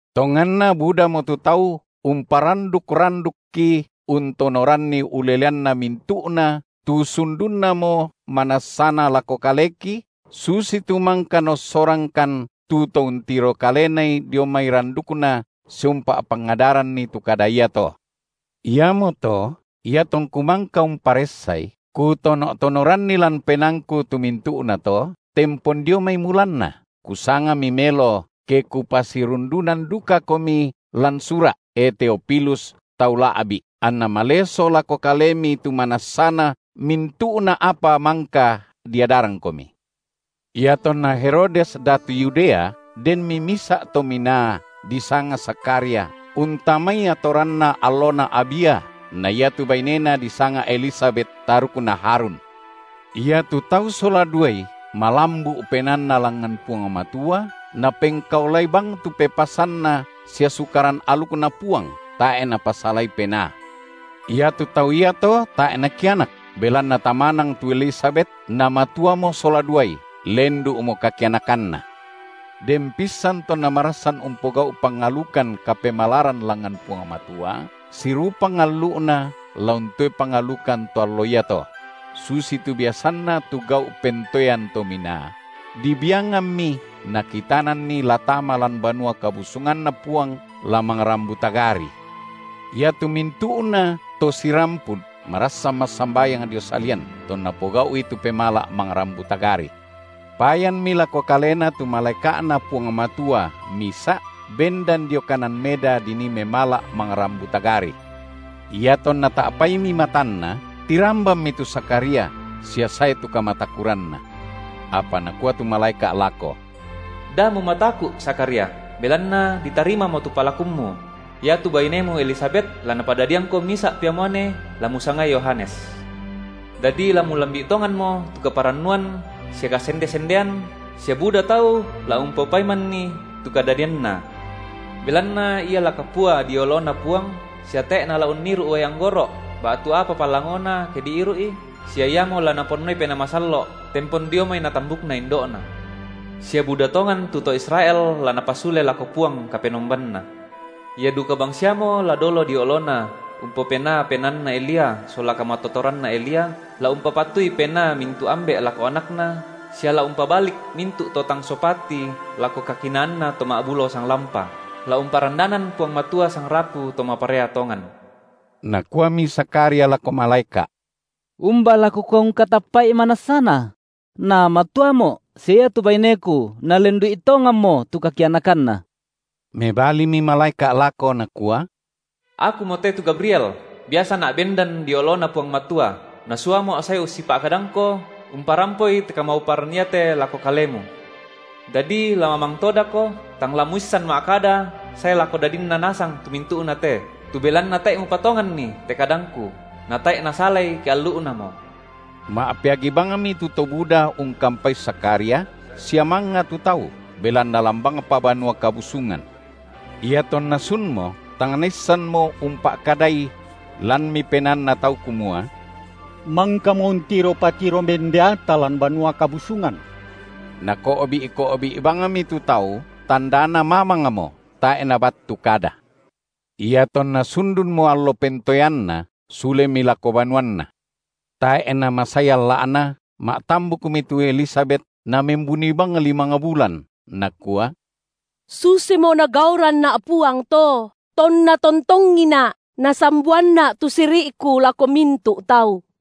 Tonganna budamo tu tau umparanduk-randukki untonoranni uleleanna mintu’na tu sundunnamo manassana lako kaleki, susitu mangka naossorangkan tu to untiro kalenai dio mai randukna sia umpa’pangadaranni tu kada iato. Iamoto iatongku mangka umparessai, kutono’-tonoranni lan penaangku tu mintu’nato tempon dio mai mulanna, kusangami melo ke kupasirundunan dukakomi lan sura’, e Teofilus, tau la’bi’, anna maleso lako kalemi tu manassana mintu’na apa mangka diadarangkomi. Iatonna Herodes datu Yudea denmi misa’ tominaa, disanga Zakharia, untamai atoranna allona Abia, na iatu bainena disanga Elisabet, tarukna Harun. Iatu tau sola duai malambu’ penaanna langngan Puang Matua, napengkaolai bang tu pepasanNa sia Sukaran alukNa Puang, tae’ napasalai penaa. Iatu tau iato tae’ nakianak, belanna tamanang tu Elisabet namatuamo sola duai, lendu’mo kakianakanna. Den pissan tonna marassan umpogau’ pangalukan kapemalaran langngan Puang Matua sirupang allu’na la untoe pangalukan to allo iato, – susitu biasanna tu gau’ pentoen to minaa, – dibiangammi nakitananni la tama lan Banua KabusunganNa Puang, la mangrambu tagari. Iatu mintu’nato sirampun marassan massambayang dio salian, tonna pogau’i tu pemala’ mangrambu tagari. Payanmi lako kalena tu malaeka’Na Puang Matua misa’ bendan dio kanan meda dinii memala’ mangrambu tagari. Iatonna ta’paimi matanna, tirambanmi tu Zakharia sia sae tu kamatakuranna. Apa nakua tu malaeka’ lako: Da mumataku’, Zakharia, belanna ditarimamo tu palakummu; iatu bainemu Elisabet la napadadiangko misa’ pia muane, la musangai Yohanes. Dadi la mulambi’ tonganmo tu kaparannuan sia kasende-sendean sia buda tau la umpopaimanni tu kadadianna. Belanna ia la kapua dio oloNa Puang sia tae’ nala unniru’ uai anggoro’ ba’tu apa palangona ke diiru’i sia iamo la Naponnoi Penaa Masallo’ tempon dio mai natambukna indo’na. Sia buda tongan tu to Israel la napasule lako Puang Kapenombanna. Ia duka bangsiamo la dolo dio oloNa umpopenaa penaanna Elia sola kamatororanna Elia, la umpapatui penaa mintu’ ambe’ lako anakna sia la umpabalik mintu’ to tang sopati lako kakinaanna to ma’bulo sanglampa, la umparandanan Puang Matua sangrapu to maparea tongan. Nakuami Zakharia lako malaeka’: Umba la kukua ungkatappa’i manassana? Namatuamo’ sia iatu baineku nalendu’i tonganmo tu kakianakanna. Mebalimi malaeka’ lako nakua: Akumote tu Gabriel, biasana’ bendan dio oloNa Puang Matua, nasuamo’ sae ussipa’kadangko umparampoi te kamauparan iate lako kalemu. Dadi la mamang todako, tang la muissan ma’kada sae lako dadinna nasang tu mintu’na te, tu belanna tae’ mupatonganni te kadangku, natae’ nasalai ke allu’namo. Ma’peagi bangmi tu to buda ungkampai Zakharia sia mangnga tu tau, belanna lan bangpa Banua Kabusungan. Iatonna sunmo, tang naissanmo umpa’kadai; lanmi penaanna tau kumua: mangkamo untiro patiro mendeata lan Banua Kabusungan. Nako’bi’-ko’bi’ bangmi tu tau tandana mamangmo tae’ nabattu kada. Iatonna sundunmo allo pentoeanna, sulemi lako banuanna. Tae’ namasai alla’na ma’tambukmi tu Elisabet namembuni bang limang bulan, nakua: Susimo Nagauranna’ Puang to, tonna tontongina’ Nasamboanna’ tu siri’ku lako mintu’tau.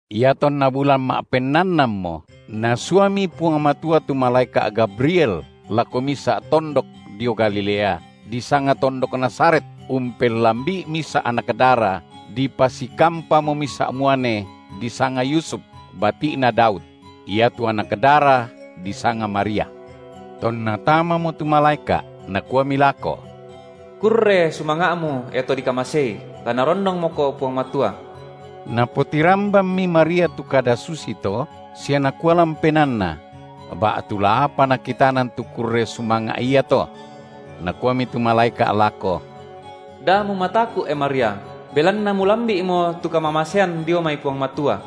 Iatonna bulan ma’pennannanmo Nasuami Puang Matua tu malaeka’ Gabriel lako misa’tondok dio Galilea, disanga tondok Nazaret, umpellambi’i misa’ anak dara, dipasikampamo misa’ muane, disanga Yusuf, bati’na Daud; iatu anak dara disanga Maria. Tonna tamamo tu malaeka’, nakuami lako: Kurre sumanga’mu, e to dikamasei la Narondongmoko Puang Matua. Napotirambanmi Maria tu kada susito sia nakua lan penaanna: ba’tu la apa nakitanan tu kurre sumanga’ iato. Nakuami tu malaeka’ lako: Da’ mumataku’, e Maria, belanna mulambi’mo tu kamamasean dio mai Puang Matua.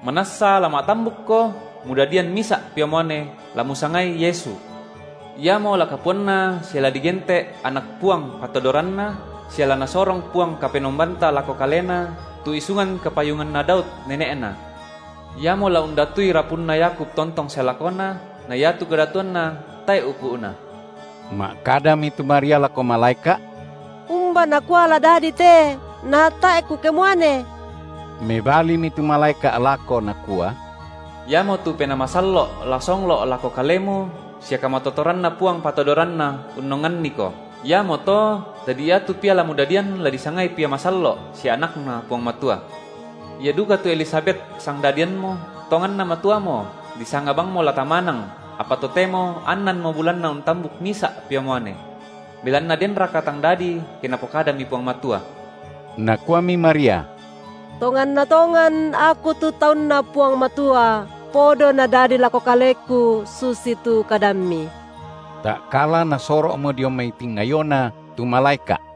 Manassa la ma’tambukko mudadian misa’ pia muane, la musangai Yesu. Iamo la kapuanna sia la digente’ Anak Puang Patodoranna sia la Nasorong Puang Kapenombanta lako Kalena tu isungan kapayunganna Daud nene’Na. Iamo la undatui rapunna Yakub tontong sae lakona na iatu kadatuanNa tae’ upu’na. Ma’kadami tu Maria lako malaeka’: Umba nakua la dadi te, natae’ kukemuane? Mebalimi tu malaeka’ lako nakua: Iamotu Penaa Masallo’ la songlo’ lako kalemu sia kamatotoranNa Puang Patodoranna unnonganniko, iamoto dadi iatu Pia la mudadian la disangai Pia masallo’ sia AnakNa Puang Matua. Ia duka tu Elisabet, sangdadiammu, tonganna matuamo, disanga bangmo la tamanang, apa totemo annanmo bulanna untambuk misa’ pia muane. Belanna denraka tang dadi ke Napokadami Puang Matua? Nakuami Maria: Tonganna tongan aku tu taunNa Puang Matua, podo nadadi lako kaleku susitu kadammi. Ta’kala nasoro’mo dio mai tingayona tu malaeka’.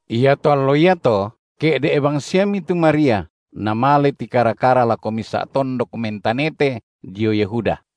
Iato allo iato ke’de’ bangsiami tu Maria namale tikara-kara lako misa’ tondok mentanete dio Yehuda.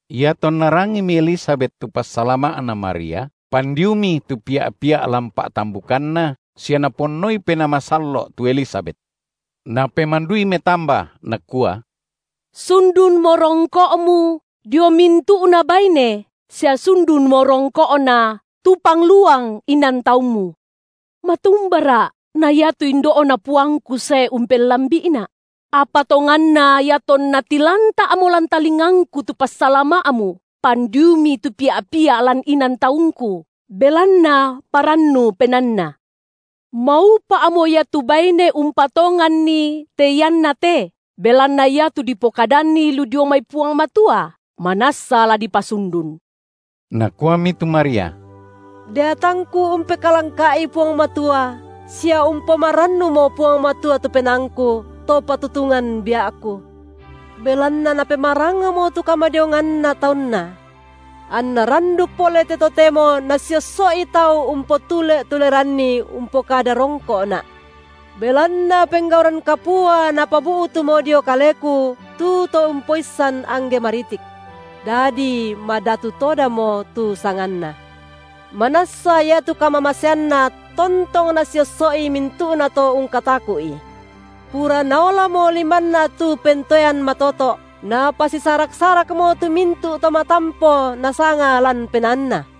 Iatonna rangimi Elisabet tu passalama’na Maria, pandiumi tu pia’-pia’ lan pa’tambukanna sia Naponnoi Penaa Masallo’ tu Elisabet. Napemandui metamba, nakua: Sundunmo rongko’mu dio mintu’na baine sia sundunmo rongko’na tu pangluang inan taummu. Matumbara’ na iatu indo’na Puangku sae umpellambi’ina’? Apa tonganna iatonna tilanta’mo lan talingangku tu passalama’mu, pandiumi tu pia’-pia’ lan inan taungku, belanna parannu penaanna. Maupa’mo ia tu baine umpatonganni te iannate, belanna iatu dipokadanni lu dio mai Puang Matua, manassa la dipasundun. Nakuami tu Maria: Deatangku umpekalangka’I Puang Matua sia umpomarannumo Puang Matua tu penaangku, To patutungan bia’ku, belanna Napemarangamo tu kamadionganna taunNa. Anna randuk pole te totemo nasiosso’i tau umpotule’-tuleranni umpokada rongko’na’, belanna penggauran kapua Napabu’tumo dio kaleku tu To umpoissan angge maritik. Dadi madatu todamo tu sanganNa, manassa iatu kamamaseanNa tontong nasiosso’i mintu’nato ungkataku’I. Pura naolamo limanNa tu pentoean matoto’, Napasisarak-sarakmo tu mintu’ to matampo nasanga lan penaanna;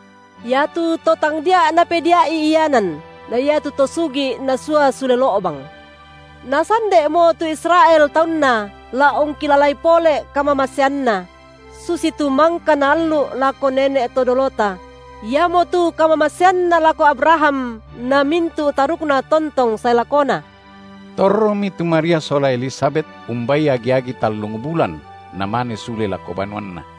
Iatu to tangdia’ Napedia’i ianan, na iatu to sugi’ Nasua sule lo’bang. Nasande’mo tu Israel taunNa, la ungkilalai pole’ kamamaseanNa, – susitu mangka Naallu’ lako nene’ to dolota – iamotu kamamaseanNa lako Abraham na mintu’ tarukna tontong sae lakona. Torromi tu Maria sola Elisabet umbai agi-agi tallung bulan namane sule lako banuanna.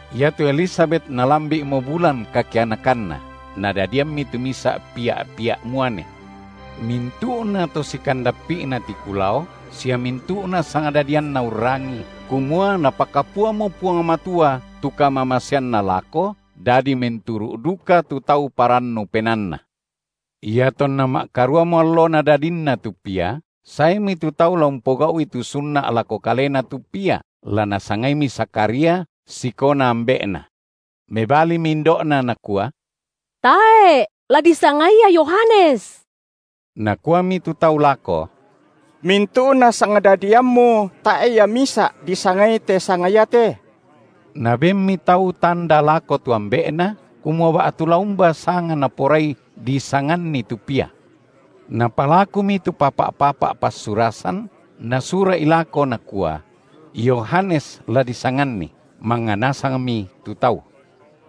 Iatu Elisabet nalambi’mo bulan kakianakanna, nadadiammi tu misa’ pia’-pia’ muane. Mintu’na to sikandappi’na tiku lao sia mintu’na sangdadianna urrangii, kumua Napakapuamo Puang Matua tu kamamaseanNa lako, dadi menturu’ duka tu tau parannu penaanna. Iatonna ma’karuamo allona dadinna tu pia, saemi tu tau la umpogau’i tu sunna’ lako kalena tu pia, la nasangaimi Zakharia sikona ambe’na. Mebalimi indo’na nakua: Tae’, la disangai ia Yohanes. Nakuami tu tau lako: Mintu’na sangdadiammu tae’ ia misa’ disangai te sanga iate! Nabenmi tau tanda lako tu ambe’ na, kumua ba’tu la umba sanga naporai disanganni tu pia. Napalakumi tu papa’-papa’ passurasan, nasura’i lako, nakua: Yohanes la disanganni. Mangnga nasangmi tu tau.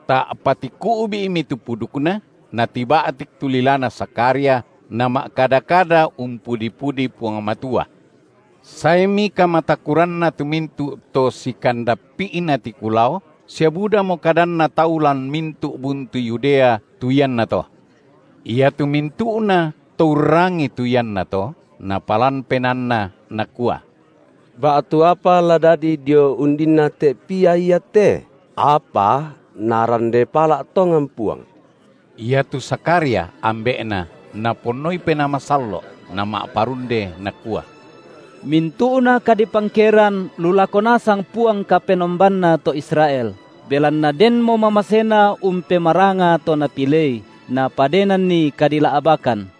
Ta’pa tiku’bi’mi tu pudukna natiba’tik tu lilana Zakharia nama’kada-kada umpudi-pudi Puang Matua. Saemi kamatakuranna tu mintu’ to sikandappi’na tiku lao sia budamo kadanna tau lan mintu’ buntu Yudea tu iannato. Iatu mintu’nato urrangii tu iannato napalan penaanna, nakua: Ba’tu apa la dadi dio undinna te pia iate? Apa Narande pala’ tongan Puang! Iatu Zakharia, ambe’na naponnoi Penaa Masallo’, nama’parunde, nakua: Mintu’na kadipangkeran lu lako nasang Puang Kapenombanna to Israel, belanna denmo mamaseNa umpemaranga to Napilei, Napadenanni kadila’bakan.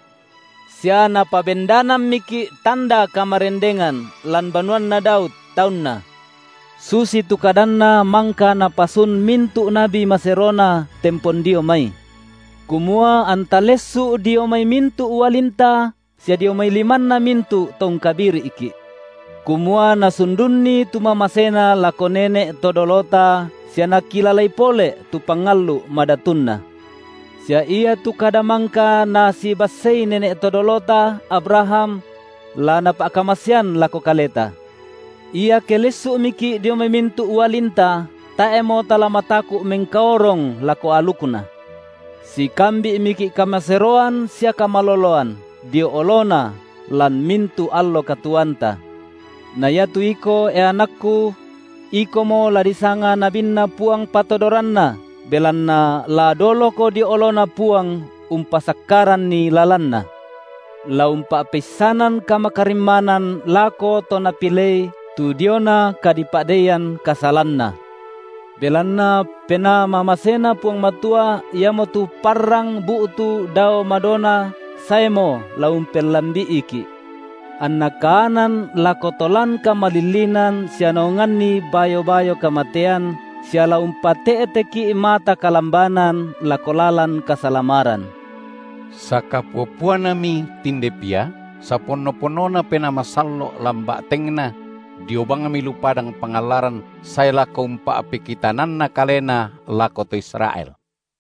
Sia Napabendanammiki’ tanda kamarendengan lan banuanna Daud, taunna, susitu kadanNa mangka napasun mintu’ nabi maseroNa tempon dio mai – kumua anta lessu’ dio mai mintu’ ualinta sia dio mai limanna mintu’ to ungkabiri’ki’; kumua Nasundunni tu mamaseNa lako nene’ to dolota sia Nakilalai pole’ tu pangallu’ madatunNa; sia iatu kada mangka Nasibassei nene’ to dolota, Abraham, la Napa’kamasean lako kaleta; iake lessu’miki’ dio mai mintu’ ualinta, tae’mo tala mataku’ mengkaorong lako alukNa; sikambi’miki’ kamaseroan sia kamaloloan, dio oloNa lan mintu’ allo katuoanta! Na iatu iko, e anakku, ikomo la disanga nabinNa Puang Patodoranna, belanna la doloko dio oloNa Puang umpasakkaranni lalanNa, la umpa’peissanan kamakarimmanan lako to Napilei tu diona kadipa’deian kasalanna, belanna penaa mamaseNa Puang Matua, iamotu Parrang bu’tu dao madona saemo la umpellambi’iki’, anna kaanan lako to lan kamalillinan sia naonganni bayo-bayo kamatean, sia la umpate’teki’ mata kalambanan lako lalan kasalamaran. Sakapua-puanami tinde pia, saponno-ponnona Penaa Masallo’ lan ba’tengna; dio bangmi lu padang pangallaran sae lako umpa’pekitananna kalena lako to Israel.